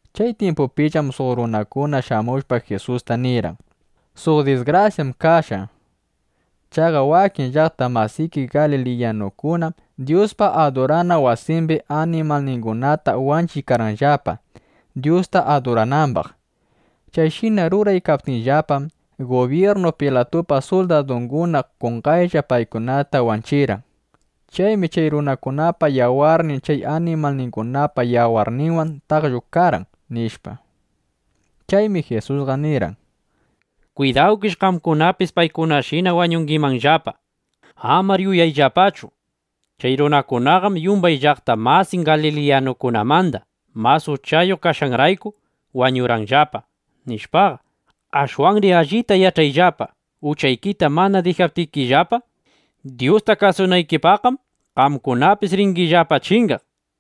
Chay tyimpupillam suq runakuna shamushpa, Jisusta nirqan: —Suq disgrasyam kashqa. Chaqa wakin llaqta masiki galiliyanukunam Dyuspa adurana wasimbi animalningunata wanchiykarqanllapa, Dyusta aduranambaq. Chayshina ruraykaptinllapam, gubyirnu Pilatupa suldadunguna qonqaylla paykunataqa wanchirqan. Chaymi chay runakunapa yawarnin chay animalningunapa yawarninwan taqllukarqan, nishpa. Chaymi Jisusqa nirqan: —(Kwidawkish qamkunapis paykunashina wañungimanllapa.) Amar yuyayllapachu: Chay runakunaqam yumbay llaqta masin galiliyanukunamanda mas uchayuq kashqanrayku, wañurqanllapa, nishpaqa. Ashwanri allita yach'ayllapa, uchaykita mana dijaptikillapa Dyusta kasunaykipaqqam, qamkunapis ringillapa chingaq.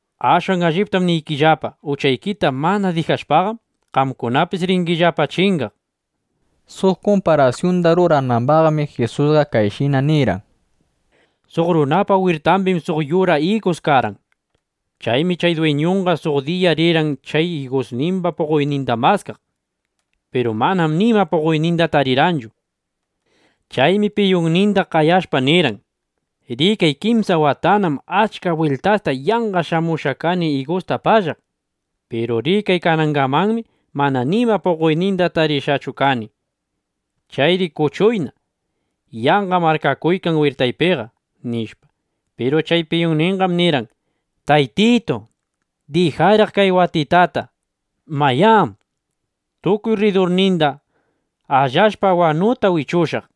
Ashwan alliptam niykillapa, uchaykita mana dijashpaqam, qamkunapis ringillapa chingaq, nishpa. Suq kumparasyunda ruranambaqmi, Jisusqa kayshina nirqan: —Suq runapa wirtambim suq yura igus karqan. Chaymi chay dwiñunqa suq diya rirqan chay igusnimba puqoyninda maskaq. Piru manam nima puqoyninda tarirqanchu. Chaymi piyunninda qayashpa nirqan: “Rikay, kimsa watanam achka bwiltasta yanqa shamushqa kani igusta pallaq. Piru rikay, kanangamanmi mana nima puqoyninda tarishqachu kani. Chayri kuchuyna. Yanqam arkakuykan wirtaypiqa”, nishpa. Piru chay piyunninqam nirqan: “Taytitu, dijayraq kay watitata. Mayá, tukuy rridurninda allashpa wanuta wichushaq.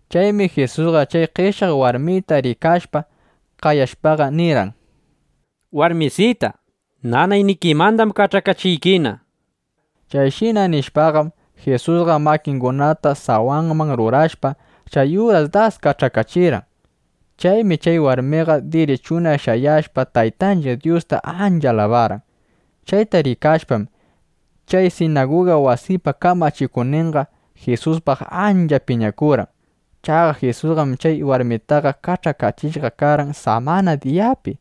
Chaymi Jisusqa chay qeshyaq warmita rikashpa, qayashpaqa nirqan: —Warmisita, nanaynikimandam kach'akachiykina. Chayshina nishpaqam, Jisusqa makingunata sawanman rurashpa, chay uras das kach'akachirqan. Chaymi chay warmiqa, dirichuna shayashpa, Taytanchiq Dyusta ancha alabarqan. Chayta rikashpam, chay sinaguga wasipa kamachikuqninqa Jisuspaq ancha piñakurqan. Chaqa Jisusqam chay warmitaqa kach'akachishqa karqan samana diyapi.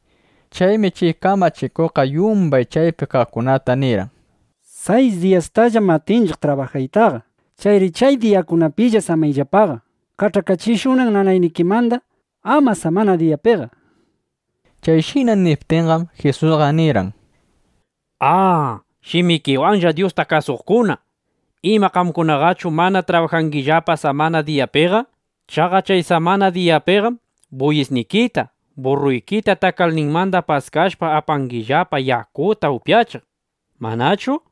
Chaymi chay kamachikuqqa yumbay chaypi kaqkunata nirqan: —Sayis diyastallam atinchiqllapa trabajaytaqa. Chayri chay diyakunapilla shamuyllapa, kach'akachishunan nanaynikimanda. ¡Ama samana diyapiqa! nishpa. Chayshina niptinqam, Jisusqa nirqan: —¡A, shimikiwanlla Dyusta kasuqkuna! ¿Ima qamkunaqachu mana trabajangillapa samana diyapiqa? Chaqa chay samana diyapiqam buyisnikita, burruykita takalninmanda paskashpa, apangillapa yakuta upyachiq, ¿manachu?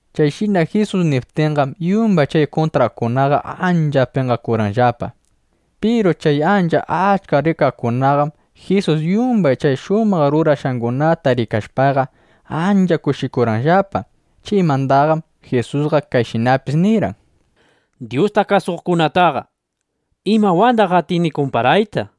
Chayshina Jisus niptinqam, yumbay chay kuntraqkunaqa ancha penqakurqanllapa. Piru chay ancha achka rikaqkunaqam, Jisus yumbay chay shumaq rurashqangunata rikashpaqa, ancha kushikurqanllapa. Chaymandaqam Jisusqa kayshinapis nirqan: —Dyustana kasuqkunataqa ¿imawandaq atini kumparayta?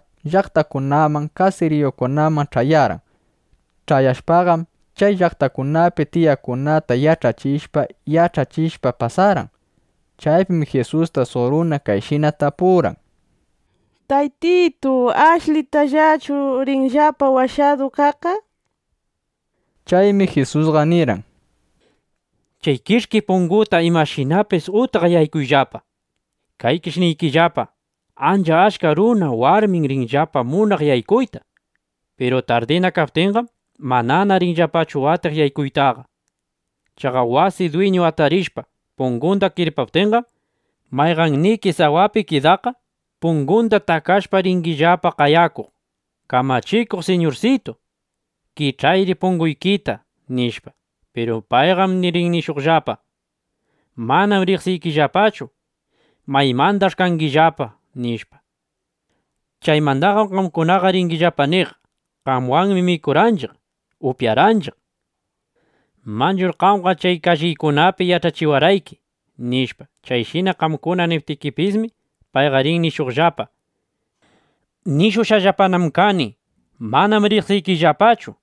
Jisusqam Jirusalinman riqshinaqa, llaqtakunaman, kasiriyukunaman ch'ayarqan. Ch'ayashpaqam, chay llaqtakunapi tiyaqkunata yach'achishpa, yach'achishpa, pasarqan. Chaypim Jisusta suq runa kayshina tapurqan: —Taytitu, ¿ashlitallachu rinllapa washadu kaqqa? nishpa. Chaymi Jisusqa nirqan: —Chay kich'ki punguta imashinapis utqa yaykuyllapa. Kaykish niykillapa, ancha achka runa warmim rinllapa munaq yaykuyta. Piru tardina kaptinqam, manana rinllapachu atiq yaykuytaqa. Chaqa wasi dwiñu atarishpa, pungunda kirpaptinqam, mayqanniki sawapi kidaqqa pungunda takashpa, ringillapa qayakuq: “Kamachikuq Siñursitu, kich'ayri punguykita”, nishpa. Piru payqam rin nishuqllapa: “Manam riqsiykillapachu. ¿Maymandach'i kangillapa?” nishpa. Chaymandaqam qamkunaqa ringillapa niq: “Qamwanmi mikurqanchiq, upyarqanchiq. Manchur qamqa chay kalliykunapi yach'achikurqayki” nishpa. Chayshina qamkuna niptikipismi, payqa rin nishuqllapa: “¡Nishushqallapanam kani: Manam riqsiykillapachu!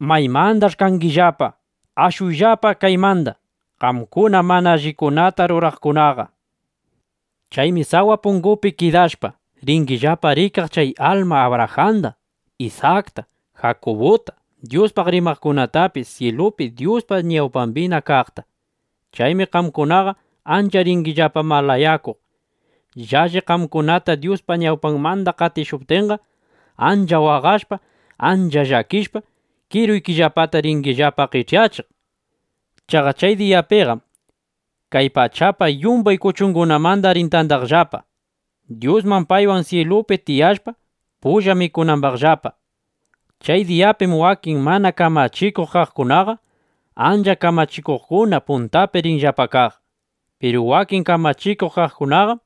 ¿Maymandach'i kangillapa? ¡Ashuyllapa kaymanda, qamkuna mana allikunata ruraqkunaqa!” nishpa. Chaymi sawa pungupi kidashpa, ringillapa rikaq chay alma Abrajanda, Isakta, Jakubuta, Dyuspaq rimaqkunatapis syilupi Dyuspa ñawpambina kaqta. Chaymi qamkunaqa ancha ringillapa malayakuq. ¡Llalli qamkunata Dyuspa ñawpanmanda qatishuptinqam, ancha waqashpa, ancha llakishpa, kiruykillapata ringillapa qech'yachiq! Chaqa chay diyapiqam kay pachapa yumbay kuchungunamanda rin tandakaqllapa Dyusman, paywan syilupi tiyashpa, pulla mikunambaqllapa. Chay diyapim wakin mana kamachikuq kaqkunaqa ancha kamachikuqna puntapi rinllapa kaq. Piru wakin kamachikuq kaqkunaqam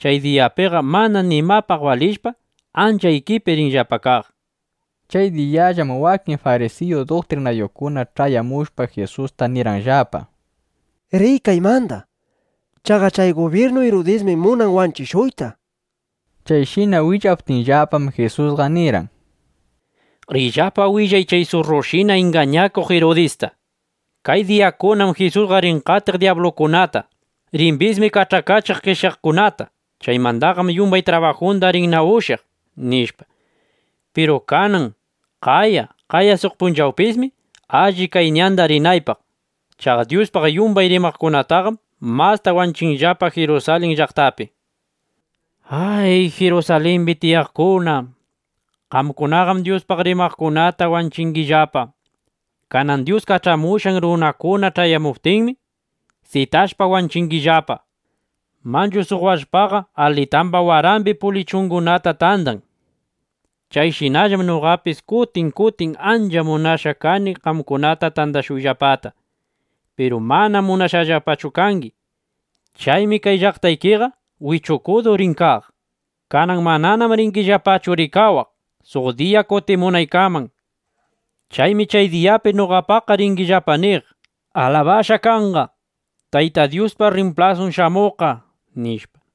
chay diyapiqa mana nimapaq balishpa, ancha ikipi rinllapa kaq. Chay diyallam wakin farisiyu duktrinayuqkuna ch'ayamushpa, Jisusta nirqanllapa: —Riy kaymanda. Chaqa chay gubyirnu Irudismi munan wanchishuyta, nishpa. Chayshina willaptinllapam, Jisusqa nirqan: —Riyllapa willay chay surrushina ingañakuq Irudista: “Kay diyakunam Jisusqa rin qatiq dyablukunata. Rimbismi kach'akachiq qeshyaqkunata. Chaymandaqam yumbay trabajunda rinna ushyaq”, nishpa. Piru kanan, qaya, qaya suq punchawpismi alli, kay ñanda rinaypaq. Chaqa Dyuspaq yumbay rimaqkunataqam masta wanchinllapa Jirusalin llaqtapi. ’¡Ay, Jirusalimbi tiyaqkuna! ¡Qamkunaqam Dyuspaq rimaqkunata wanchingillapa! ¡Kanan Dyus kach'amushqan runakuna ch'ayashuptinmi, sitashpa wanchingillapa! Manchu suq wallpaqa alitamba warambi pulichitungunata tandan. Chayshinallam noqapis kutin kutin ancha munashqa kani qamkunata tandashuyllapata. Piru manam munashqallapachu kangi. Chaymi kay llaqtaykiqa wichukudu rin kaq. Kanan mananam ringillapachu rikawaq, suq diya kutimunaykaman. Chaymi chay diyapi noqapaqqa ringillapa niq: “¡Alabashqa kanqa, Tayta Dyuspa rrimplasun shamuqqa!” nishpa.